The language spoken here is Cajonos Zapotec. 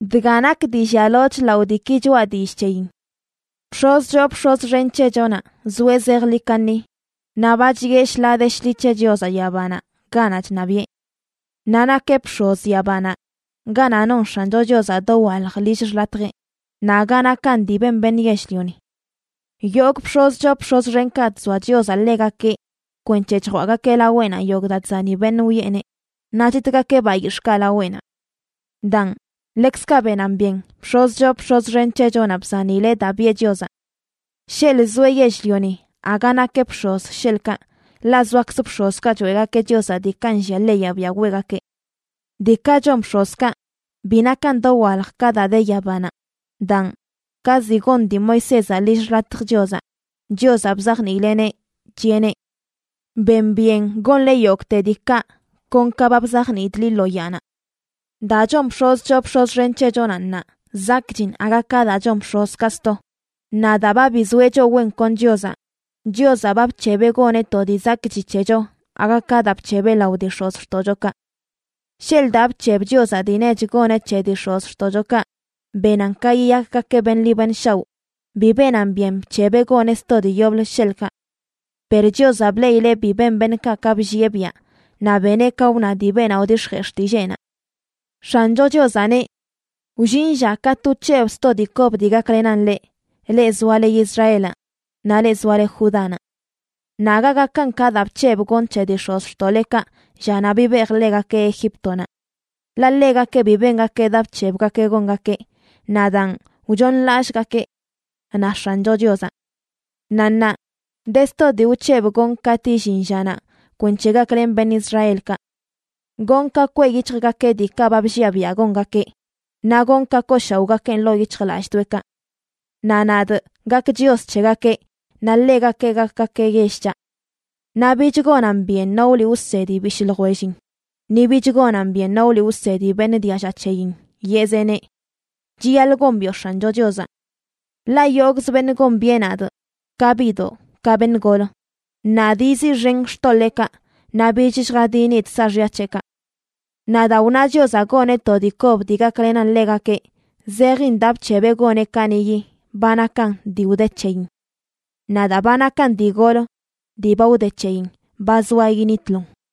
Dga nak dii llialoch lao diiki choꞌa dillꞌ c̱heyin: bx̱oz choo bx̱oz xen c̱hechonaꞌ zoeꞌ zejḻi kaṉi naꞌ ba chiꞌe shḻaa de shḻi c̱he Chiozaꞌ yabanaꞌ ganaꞌ chṉabiꞌe. Naꞌ nakeꞌ bx̱oz yabanaꞌ ganaꞌ non X̱ancho Chiozaꞌ dowalj lill xḻatjeꞌ, naꞌ aga nakan dii ben beṉꞌ yell-lioni. Yogꞌ bx̱oz choo bx̱oz xenkaꞌ chzoa Chiozaꞌ ḻegakeꞌ kwenc̱he chjwaꞌgakeꞌ laweꞌnaꞌ yogꞌ daa chzani beṉꞌ wiꞌeneꞌ, naꞌ chitgakeꞌ bayix̱ꞌkaꞌ laweꞌnaꞌ. Daan, ḻekzkaꞌ benan byen bx̱oz choo bx̱oz xen c̱hechonaꞌ bzanileꞌ daa biꞌe Chiozaꞌ. Sheḻꞌ zoeꞌ yell-lioni aga nakeꞌ bx̱oz, sheḻꞌkaꞌ, ḻaꞌ zoakz bx̱ozkaꞌ choeꞌgakeꞌ Chiozaꞌ diikaꞌ nllia leyaꞌ biaꞌ weꞌgakeꞌ. Diikaꞌ chon bx̱ozkaꞌ bi nakan dowalj ka daa de yabanaꞌ. Daan, ka ziꞌ gon dii Moisézaꞌ lill xḻatj Chiozaꞌ, Chiozaꞌ bzajniileꞌneꞌ, chiꞌeneꞌ: “Ben byen gonle yogꞌte diikaꞌ kon ka ba bzajniidꞌ liꞌ lo yaanaꞌ.” Daa chon bx̱oz choo bx̱oz xen c̱hechonaꞌ ṉaa zakꞌchin aga ka daa chon bx̱ozkaꞌ sto. Naꞌ daa ba bizoeꞌ choꞌ wen kon Chiozaꞌ, Chiozaꞌ ba bc̱hebeꞌ goneꞌ to dii zakꞌchi c̱hecho aga ka daa bc̱hebeꞌ lao dii x̱ozxtoꞌchokaꞌ. Sheḻꞌ daa bc̱heb Chiozaꞌ dii nech goneꞌ c̱he dii x̱ozxtoꞌchokaꞌ benan ka yiyakgakeꞌ beṉꞌ ḻi beṉꞌ shaoꞌ, bi benan byen bc̱hebeꞌ goneꞌ sto dii yoblə, sheḻꞌkaꞌ. Per Chiozaꞌ bleꞌileꞌ bi ben beṉꞌkaꞌ ka bllieꞌ biaꞌ, naꞌ beneꞌ ka wna dii beenaꞌ wdix̱jee xtilleenaꞌ: X̱ancho Chiozaꞌ neꞌ: Wllin lla katꞌ wc̱hebꞌ sto dii kob dii gaklenan leꞌ, leꞌ zoale Israelaꞌ naꞌ leꞌ zoale Judánaꞌ. Naꞌ aga gakan ka daa bc̱hebꞌ gonꞌ c̱he dii x̱ozxtoꞌlekaꞌ llanaꞌ bibejꞌ ḻegakeꞌ Egíptonaꞌ. Ḻaꞌ ḻegakeꞌ bi bengakeꞌ daa bc̱hebgakeꞌ gongakeꞌ, naꞌ daan wchooṉlallꞌgakee, na X̱ancho Chiozaꞌ. Naꞌ ṉaa de sto dii wc̱hebꞌ gonꞌ katꞌ illin llanaꞌ kwenc̱he gaklenꞌ beṉꞌ Israelkaꞌ. Gonꞌ ka kweꞌ yic̱hjgakeꞌ diikaꞌ ba blliaꞌ biaꞌ gongakeꞌ, naꞌ gonꞌ ka kooshaoꞌgakeꞌn ḻoo yic̱hjlallꞌdoꞌekaꞌ. Naꞌ nadꞌ gakꞌ Chios c̱hegakeꞌ, naꞌ ḻegakeꞌ gakgakeꞌ yell c̱haꞌ. Naꞌ bich gonan byen no wliꞌ wsedi bishꞌ ljwellin, ni bich gonan byen no wliꞌ wsedi beṉꞌ dialla c̱heyin, yeꞌzeꞌneꞌ: “Chiyaḻꞌ gombiꞌo X̱ancho Chiozaꞌ”, ḻaꞌ yogꞌz beṉꞌ gombiꞌe nadꞌ, ka biꞌdoꞌ ka beṉꞌ gol. “Nadꞌ yiziꞌxenꞌ xtoḻeekaꞌ, naꞌ bich lljadinidꞌ saaxya c̱heꞌkaꞌ.” Naꞌ daa wna Chiozaꞌ goneꞌ to dii kob dii gaklenan ḻegakeꞌ, zejin daa bc̱hebeꞌ goneꞌ kaniꞌyi ba nakan dii wde c̱heyin. Naꞌ daa ba nakan dii gol dii ba wde c̱heyin ba zoa yinitlon.